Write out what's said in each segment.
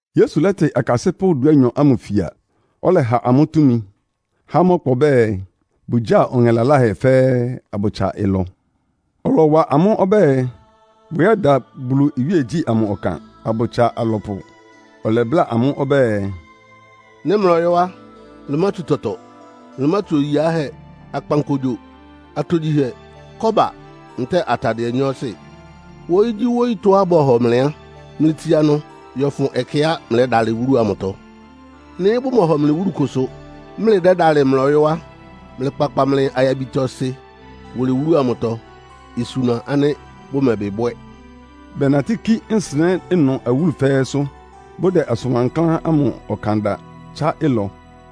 Yesu lɛ́tɩ akasɩ́pʋ́ dúanyɔ ámʋ fia, ɔlɛha amʋ́ túmi, há amʋ́ ɔkpa ɔbɛ́ɛ, bʋgyáa ɔŋɛ laláhɛ fɛ́ɛ́, abʋtsa ɩlɔ. Ɔlɔwa amʋ́ ɔbɛ́ɛ, bʋyɛ́da Bulu iwíegyí ámʋ ɔkan, abʋtsa alɔpʋ. Ɔlɛbláa amʋ́ ɔbɛ́ɛ, “Nɩ́ mlɔyɔ́ á, mlɩmátsu tɔtɔ. Mlɩmátsu oyi yiáhɛ́, akpankogyo, atogyihɛ, kɔ́ba ntɛ́ɛ atadɩɛ nyɔɔsɩ. Wóyígyíwóyítɔ́á bɔ́hɔ mlɩ á, mlɩtsia ɩnʋ yɔ́fʋn ɛkɛá mlɛ́dalɩ wúlu amʋtɔ. Nɩ́ bʋmɔhɔ mlɩ wúlu kʋsʋ, mlɩdɛ́dalɩ mlɔyɔ́ á, mlɩkpakpa mlɩ ayabitɔ-ɩsɩ wʋlɩ wúlu amʋtɔ, isuna ánɩ́ bʋmɛbɩ bwɛ́.” Bɛnatɩ́ kí nsɩnɛ́ ɩnʋ awúlu fɛ́ɛ́sʋ́, bʋdɛ asʋn wankláán ámʋ ɔkan da, tsá ɩlɔ.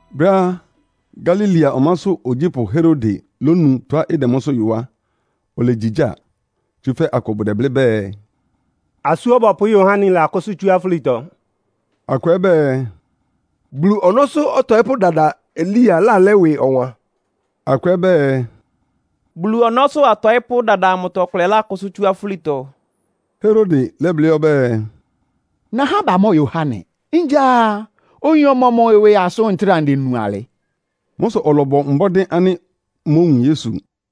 Brɛ́á Galilea ɔmásʋ́ ogyípʋ́ Herode lónu tɔ́á ɩdɛ mʋ́sʋ́ yɔ á, olegyigyáa. Tsúfɛ́ akʋ bʋdɛblɩ́ bɛɛ, “Asú Ɔbɔpʋ́ Yohane lakʋ́sʋ́ tsú afúlitɔ.” Akʋ ɛ́ bɛɛ, “Bulu ɔnɔ́sʋ́ ɔtɔɩ́pʋ́ dada Elia lálɛ́ ɩwɩ ɔwan.” Akʋ ɛ́ bɛɛ, “Bulu ɔnɔ́sʋ́ atɔɩ́pʋ́ dada amʋtɔ ɔkʋ lákʋ́sʋ́ tsú afúlitɔ.” Herode lɛ́blɩ́ ɔbɛ́ɛ, “Nahá batɩn Yohane. Ngya oyin ɔmɔmʋ ɩwɩ asʋ́n ntráa ndenu alɩ?” Mʋ́ sʋ ɔlɔbɔ mbɔ́dɩ́ ánɩ́ mówun Yesu.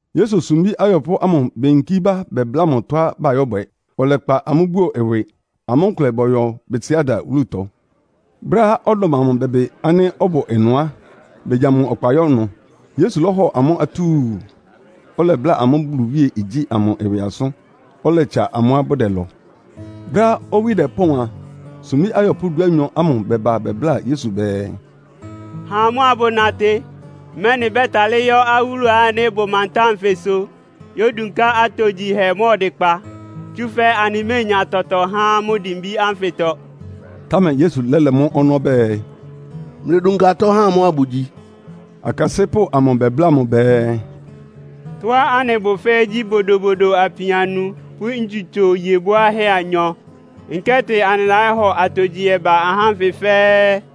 Yesu sumbí ayɔpʋ́ amʋ beyinkí bá bɛbláa mʋ tɔ́á bayɔ́bwɛ. Ɔlɛkpa amʋ́ buo ɩwɩ, amʋ́ nkʋlɛ bɔyɔ Betsaida wúlutɔ. Brɛ́á ɔdɔm amʋ bɛbɩ ánɩ́ ɔbʋ ɩnʋ á, begya mʋ ɔkpa yɔ́ ɩnʋ. Yesu lɔ́hɔ amʋ́ atúu, ɔlɛbláa amʋ́ Bulu iwíegyí amʋ ɩwɩ asʋ́n, ɔlɛtsa amʋ́á bʋdɛlɔ. Brɛ́á owí dɛpɔ́ɔn a, sumbí ayɔpʋ́ dúanyɔ ámʋ bɛba bɛbláa Yesu bɛɛ, “Ha amʋ́ abʋnatɩ, mɛ́nɩ bɛ́talɩ́ yɔ́ awúlu ánɩ́ ɩbʋ mantáa nfɩsʋ yódunká atogyihɛ mʋ́a ɔdɩkpa, tsúfɛ́ anɩméenya tɔtɔ há amʋ́ dimbí ánfɩtɔ.” Támɛ Yesu lɛ́lɛ mʋ́ ɔnɔ́ ɔbɛ́ɛ, “Mlɩdunka atɔ́ ha amʋ́ abʋgyi.” Akasɩ́pʋ́ amʋ bɛbláa mʋ bɛɛ, “Tɔ́á anɩbʋ fɛ́ɛ́ gyí bodobodo apin anu pʋ́ ntsutso iye bwáhɛ́ anyɔ. Nkɛ́tɩ anɩlayɔ́hɔ atogyihɛ ba ahá ánfɩ fɛ́ɛ́.”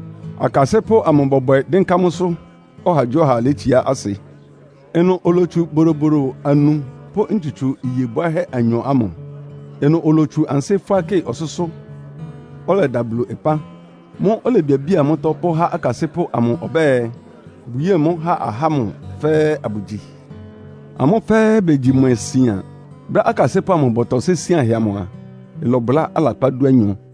Akasɩ́pʋ́ amʋ bɔbwɛ dɩ́nká mʋ́sʋ́, ɔhagyíɔha létsiá asɩ. Ɩnʋ olotsu bodobodo anu pʋ́ ntsutso iye bwáhɛ́ anyɔ ámʋ. Ɩnʋ olotsu ansɩ́ fʋ́á kɩ́ɩ ɔsʋ́sʋ́, ɔlɛda Bulu ɩpán. Mʋ́ʋ́ olebiabía mʋ́tɔ́ pʋ́há akasɩ́pʋ́ amʋ ɔbɛ́ɛ, bʋyée mʋ́ ha ahá ámʋ fɛ́ɛ́ abʋgyi. Amʋ fɛ́ɛ́ begyi mwɛ sian. Brɛ́á akasɩ́pʋ́ amʋ bɔtɔsɩ́ isíanhɛ amʋ a, ɩlɔbʋlá alakpá dúanyɔ.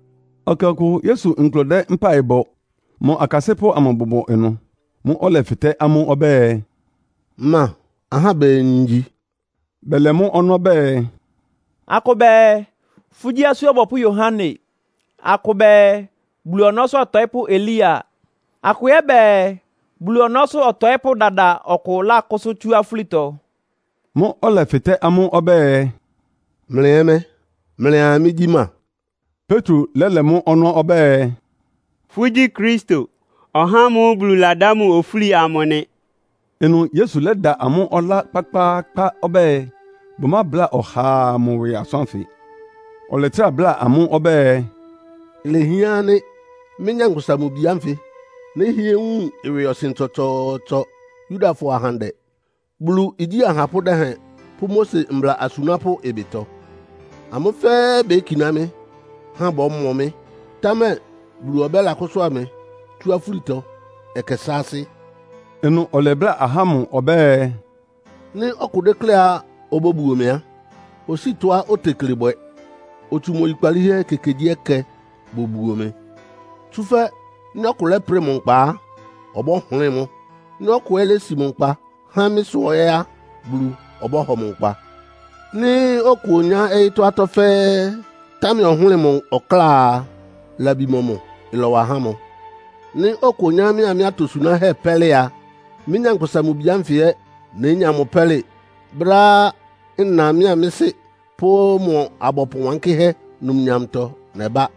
Ɛkɛ ɔkʋ Yesu nkʋlɛ dɛ́ mpáɩ bɔ, mʋ akasɩ́pʋ́ amʋ bʋbʋ ɩnʋ. Mʋ́ʋ́ ɔlɛfɩtɛ́ amʋ́ ɔbɛ́ɛ, “Ma ahá bɛɛ ngyi?” Bɛlɛ mʋ́ ɔnɔ́ bɛɛ, “Akʋ bɛɛ, fʋ́gyí Asú Ɔbɔpʋ́ Yohane. Akʋ bɛɛ, Bulu Ɔnɔ́sʋ́ Ɔtɔɩ́pʋ́ Elia. Akʋ ɛ́ bɛɛ, Bulu ɔnɔ́sʋ́ ɔtɔɩ́pʋ́ dada ɔkʋ lákʋ́sʋ́ tsú afúlitɔ.” Mʋ́ʋ́ ɔlɛfɩtɛ́ amʋ́ ɔbɛ́ɛ, “Mlɩ ɛ́ mɛ́? Mlɩa mɩ́gyí ma?” Petro lɛ́lɛ mʋ́ ɔnɔ́ ɔbɛ́ɛ, “Fʋ́gyí Kristo, (ɔhá ámʋ́ʋ́ Bulu ladá mʋ ofúli amʋ) nɩ.” Ɩnʋ Yesu lɛ́da amʋ́ ɔlá kpákpáákpá ɔbɛ́ɛ, bʋmábláa ɔhaa mʋ ɩwɩ asʋ́n ánfɩ. Ɔlɛtrá bláa amʋ́ ɔbɛ́ɛ, “Ilehián ánɩ́ mɩ́, Nyankpʋsa-Mʋ-Bi ánfɩ nɛ́hɩɛ wun ɩwɩɔsɩn tsɔtsɔɔtsɔ Yudafɔ ahandɛ, Bulu igyí ahapʋ́ dɛhɛn pʋ́ Mose mbla asunápʋ́ ɩbɩtɔ; amʋ́ fɛ́ɛ́ békiná mɩ́, há bɔ́mɔ mɩ́, támɛ Bulu ɔbɛ́lakʋ́sʋ́a mɩ tsú afúlitɔ ɛkɛ sáásɩ́.” Ɩnʋ ɔlɛbláa ahá ámʋ ɔbɛ́ɛ, “Nɩ́ ɔkʋ dékléá obóbuo mɩ á, osíi tɔ́á otekle bwɛ, otsu mʋ oyikpalíhɛ ekekegyíɛkɛ bobuo mɩ. Tsúfɛ́ nɩ́ ɔkʋ lɛ́prɩ mʋ nkpa á, ɔbɔ́hʋlɩ́ɩ mʋ́. Nɩ́ ɔkʋ ɛ́ lési mʋ nkpa há mɩ́ sʋ ɛ́ á, Bulu ɔbɔ́hɔ mʋ nkpa. Nɩ́ ɔkʋ onyá ɔyɩ́tɔ́ atɔ́ fɛ́ɛ́, támɛ ɔhʋ́lɩ mʋ ɔkláa a, labi mɔmʋ ɩlɔwa há mʋ? Nɩ́ ɔkʋ onyá mɩ́a mɩ́ atosunáhɛ́ pɛ́lɩ a, mɩ́, Nyankpʋsa-Mʋ-Bi ánfɩ ɛ́ nénya mʋ pɛ́lɩ brɛ́á nna mɩ́a mɩ́ Sɩ́ pʋ́ mʋ abɔpʋ wánkɩ́hɛ́ numnyamtɔ nɛbá.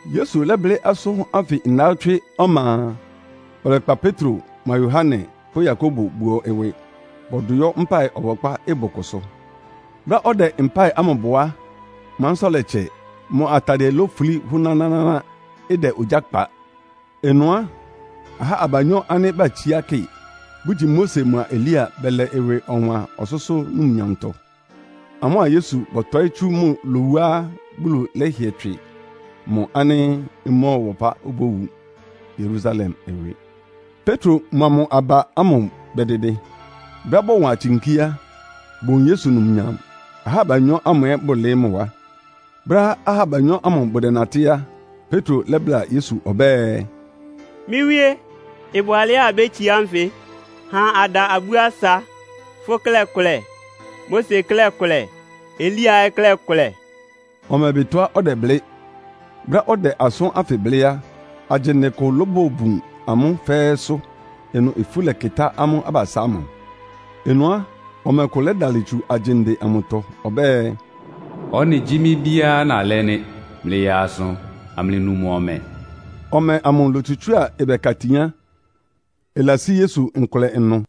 Yesu lɛ́blɩ́ asʋ́n ánfɩ ndawɔ́tswɩ́ ɔma a, ɔlɛkpa Petro mʋa Yohane pʋ́ Yakobo buo ɩwɩ, bɔdʋ yɔ́ mpáɩ ɔbɔkpá ɩbʋ kʋsʋ. Brɛ́á ɔdɛ mpáɩ ámʋ bɔ á, mʋ ansɩ́tɔ́ lɛtsɛ. Mʋ atadɩɛ lofulí hʋ́nánáná, ɩdɛ ogyá kpa. Ɩnʋ á, ahá abanyɔ́ ánɩ́ batsíá kɩ, bʋgyi Mose mʋa Elia bɛlɛ ɩwɩ ɔwan ɔsʋ́sʋ́ numnyamtɔ. Amʋ́a Yesu bɔtɔɩ́ tsú mʋ lowuá Bulu lɛ́hɩɛ tswɩ mʋ ánɩ́ ɩmɔ́ɔwa ɔpá obówu Yerusalem ɩwɩ. Petro mʋa mʋ aba ámʋ bɛdɩdɩ. Brɛ́á bɔwan tsinkí á, bowun Yesu numnyam, ahá abanyɔ́ ámʋ ɛ́ bʋlɩɩ́ mʋ wá. Brɛ́á ahá abanyɔ́ ámʋ bʋdɛnatɩ́ á, Petro lɛ́bláa Yesu ɔbɛ́ɛ, “Mɩ́ Wíé, ɩbʋ alɛ́á abétsiá nfɩ. Ha ada abú asa. Fʋ́ klɛ́ kʋlɛ, Mose klɛ́ kʋlɛ, Elia ɛ́ klɛ́ kʋlɛ.” (Ɔmɛbɩ tɔ́á ɔdɛblɩ́). Brɛ́á ɔdɛ asʋ́n ánfɩ blɩ́ á, agyinde kʋ lobobun amʋ́ fɛ́ɛ́sʋ́. Ɩnʋ ifu lɛkɩtá amʋ́ abasá ámʋ. Ɩnʋ á, ɔmɛ kʋ lɛdalɩ tsu agyinde amʋtɔ ɔbɛ́ɛ, “Ɔ́nɩ gyí mɩ́ Bíá nalɛ́ nɩ́. Mlɩyaa asʋ amlɩnu mʋ ɔmɛ.” Ɔmɛ amʋ lótsutsúa ɩbɛka tin á, ɩlasí Yesu nkʋlɛ ɩnʋ.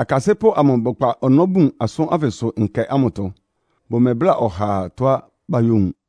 Akasɩ́pʋ́ amʋ bɛkpa ɔnɔ́ bun asʋ́n ánfɩsʋ nkɛ ámʋtɔ. Bʋmɛbláa ɔhaa ɩtɔ́á bayówun.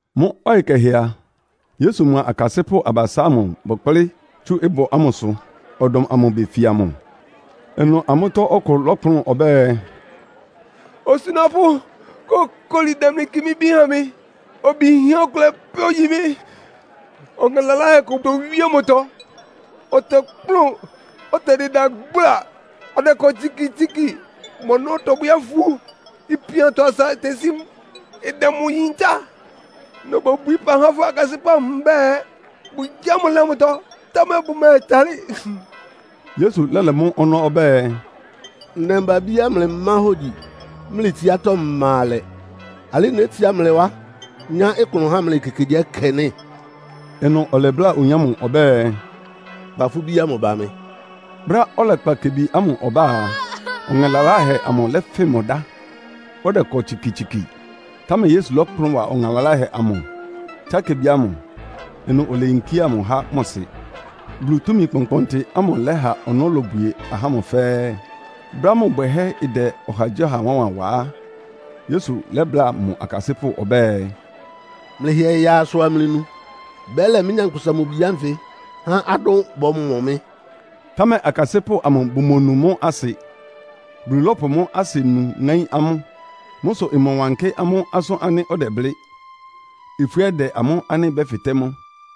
Mʋ́ ɔyɩ kɛhɛ a, Yesu mʋa akasɩ́pʋ́ abasá ámʋ bɛkplɩ́ tsú ɩbʋ ámʋsʋ, ɔdɔm amʋ befia mʋ. Ɩnʋ amʋ́tɔ́ ɔkʋ lɔ́kplʋn ɔbɛ́ɛ, “Osunápʋ́, kókoli, damli kɩ mɩ́ bí ha mɩ. Obi yinhɛ́ ɔkʋlɛ pɛ́ ogyi mɩ́. Ɔŋɛ laláhɛ kʋ towíé mʋtɔ, ɔtɔkplʋ́n. Ɔtɛdɩda gbla, ɔdɛkɔ tsikitsiki, mʋ ɔnɔ́ tɔbwɛ́ afu. Ipiantɔ asa itesí mʋ, ɩdɛ mʋ yintá. Nobobwií ɩpa há fʋ́ akasɩ́pʋ́ amʋ mbɛ́ɛ, bʋgyáa mʋ́ lɛ mʋtɔ, támɛ bʋmɛtalɩ́.” Yesu lɛ́lɛ mʋ́ ɔnɔ́ ɔbɛ́ɛ, “Ndɛmba-abíá mlɩmá hógyi, mlɩ tsiátɔ́ ma alɛ. Alɩ́ nétsiá mlɩ wá, nyá klʋn há mlɩ ekekegyíɛkɛ nɩ́?” Ɩnʋ ɔlɛbláa oyin ámʋ ɔbɛ́ɛ, “Kpa fʋ́ bí ámʋ ba mɩ.” Brɛ́á ɔlɛkpa kebi ámʋ ɔbá á, ɔŋɛ laláhɛ amʋ lɛ́fɩn mʋ dá, ɔdɛkɔ tsikitsiki. Támɛ Yesu lɔ́kplʋn wa ɔŋɛ laláhɛ amʋ, tsá kebi ámʋ. Ɩnʋ oleyinkía mʋ há mʋ sɩ. Bulu túmi kpɔnkpɔntɩ ámʋ lɛha ɔnɔ́ lobwie ahá ámʋ fɛ́ɛ́. Brɛ́á mʋ bwɛhɛ́ ɩdɛ ɔhagyíɔha wánwan wa á, Yesu lɛ́bláa mʋ akasɩ́pʋ́ ɔbɛ́ɛ, “Mlɩhɩɛ yaa asʋ amlɩnu. Bɛ́lɛ mɩ́, Nyankpʋsa-Mʋ-Bi ánfɩ há adʋ́n bɔ́mɔ mɩ́.” Támɛ akasɩ́pʋ́ amʋ bomonu mʋ́ asɩ. Bulu lɔ́pʋ mʋ́ asɩnu ŋáín amʋ́. Mʋ́ sʋ ɩmɔwankɩ́ amʋ́ asʋ́n ánɩ́ ɔdɛblɩ́. Ifú ɛ́ dɛ amʋ́ ánɩ́ bɛ́fɩtɛ́ mʋ.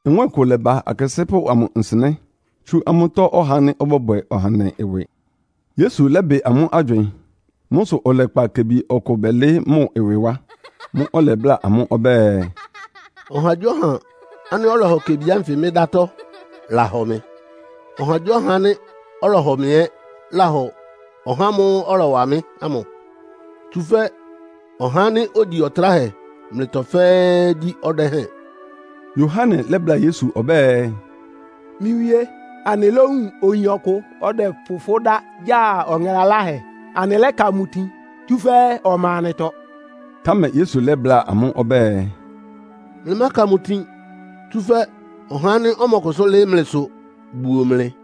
Nwɛ́ɛn kʋ lɛ́ba akasɩ́pʋ́ amʋ nsɩnɛ́, tsú amʋ́tɔ́ ɔhá ánɩ́ ɔbɔ́bwɛ ɔhandɛ ɩwɩ. Yesu lɛ́bɩ amʋ́ agywɩɩn. Mʋ́ sʋ ɔlɛkpa kebi ɔkʋ bɛlɩɩ́ mʋ ɩwɩ wá. Mʋ́ʋ́ ɔlɛbláa amʋ́ ɔbɛ́ɛ, “Ɔhagyíɔha ánɩ́ ɔlɔhɔ kebi ánfɩ mɩ́ dátɔ́ lahɔ mɩ. Ɔhagyíɔha ánɩ́ ɔhɔ mɩ ɛ́ lahɔ ɔhá ámʋ́ʋ́ ɔlɔwa mɩ́ ámʋ. Tsúfɛ́ ɔhá ánɩ́ ogyi ɔtráhɛ mlɩtɔ fɛ́ɛ́ gyí ɔdɛ́hɛn.” Yohane lɛ́bláa Yesu ɔbɛ́ɛ, “Mɩ́ Wíé, anɩlówun oyin ɔkʋ dɛ́pʋ fʋ́ dá gya ɔŋɛ laláhɛ, anɩlɛ́ka mʋ tin, tsúfɛ́ ɔma anɩtɔ.” Támɛ Yesu lɛ́bláa amʋ́ ɔbɛ́ɛ, “Mlɩmáka mʋ tin! Tsúfɛ́ ɔhá ánɩ́ ɔmɔkʋsʋ́ lɩ́ɩ́ mlɩsʋ buo mlɩ.”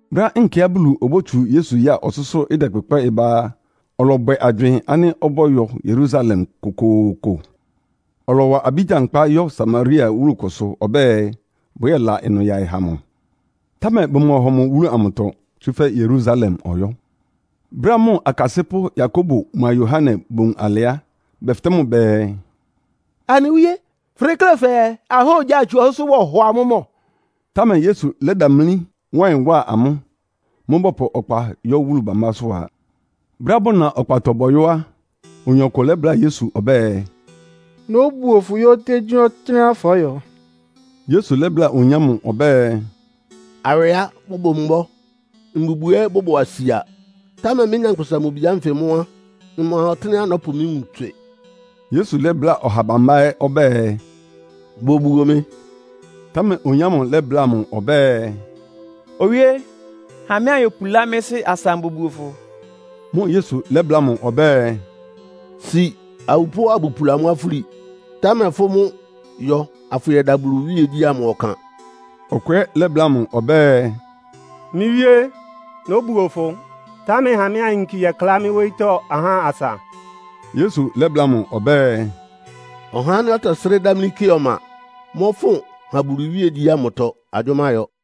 Brɛ́á nkɛá Bulu obótsu Yesu ya ɔsʋ́sʋ́ dɛkpʋkpɛ́ ba a, ɔlɔbwɛ agywɩɩn ánɩ́ ɔbɔ́yɔ Yerusalem kokooko. Ɔlɔwa abí gyankpá yɔ́ Samaria wúlu kʋsʋ ɔbɛ́ɛ, bʋyɛ́la ɩnʋ yaɩ ha mʋ. Támɛ bʋmɔhɔ mʋ wúlu amʋtɔ, tsúfɛ́ Yerusalem ɔyɔ́. Brɛ́á mʋ akasɩ́pʋ́ Yakobo mʋa Yohane bowun alɩ á, bɛfɩtɛ́ mʋ bɛɛ, “Anɩ Wíé, fʋdeklé fɛɛ ahá ogyá itsu ɔsʋ́sʋ́ bɔhɔ amʋ́ mɔ́?” Támɛ Yesu lɛ́damlí, wá ɩyɩn wá amʋ́. Mʋ́ʋ́ bɔpʋ ɔkpa yɔ́ wúlu bámbásʋ́ a. Brɛ́á bʋna ɔkpatɔ bɔyɔ́ á, oyin ɔkʋ lɛ́bláa Yesu ɔbɛ́ɛ, “Nóbuo fʋ yɔ́ ɔtɩ́nɛgyíɔtɩ́nɛ́á fɔyɔ́.” Yesu lɛ́bláa oyin ámʋ ɔbɛ́ɛ, “Awɩá bʋbʋ mbɔ́, mbubwi ɛ́ bʋbʋ asia, támɛ mɩ́, Nyankpʋsa-Mʋ-Bi ánfɩ mʋ́ á, mma ɔtɩ́nɛ́á nɔ́pʋ mɩ́ nwun tswɩ.” Yesu lɛ́bláa ɔha bambá ɛ́ ɔbɛ́ɛ, “Bobuo mɩ.” Támɛ oyin ámʋ lɛ́bláa mʋ ɔbɛ́ɛ “Owíé, ha mɩ́ anyopulá mɩ́ sɩ́ asa ambobuo fʋ.” Mʋ́ʋ́ Yesu lɛ́bláa mʋ ɔbɛ́ɛ, “Si awupʋ́ abʋpula amʋ́ afúli. Támɛ fʋ́ mʋ́ yɔ afʋyɛda Bulu iwíegyí ámʋ ɔkan.” Ɔkʋ ɛ́ lɛ́bláa mʋ ɔbɛ́ɛ, “Mɩ́ Wíé, nóbuo fʋ, támɛ ha mɩ́ anyinki yɛklá mɩ́ wóyítɔ́ ahá asa.” Yesu lɛ́bláa mʋ ɔbɛ́ɛ, “Ɔhá ánɩ́ ɔtɛsrɩ́ dámlí kɩ ɔma mɔ́fʋn ha Bulu iwíegyí ámʋtɔ agyʋ́má yɔ.”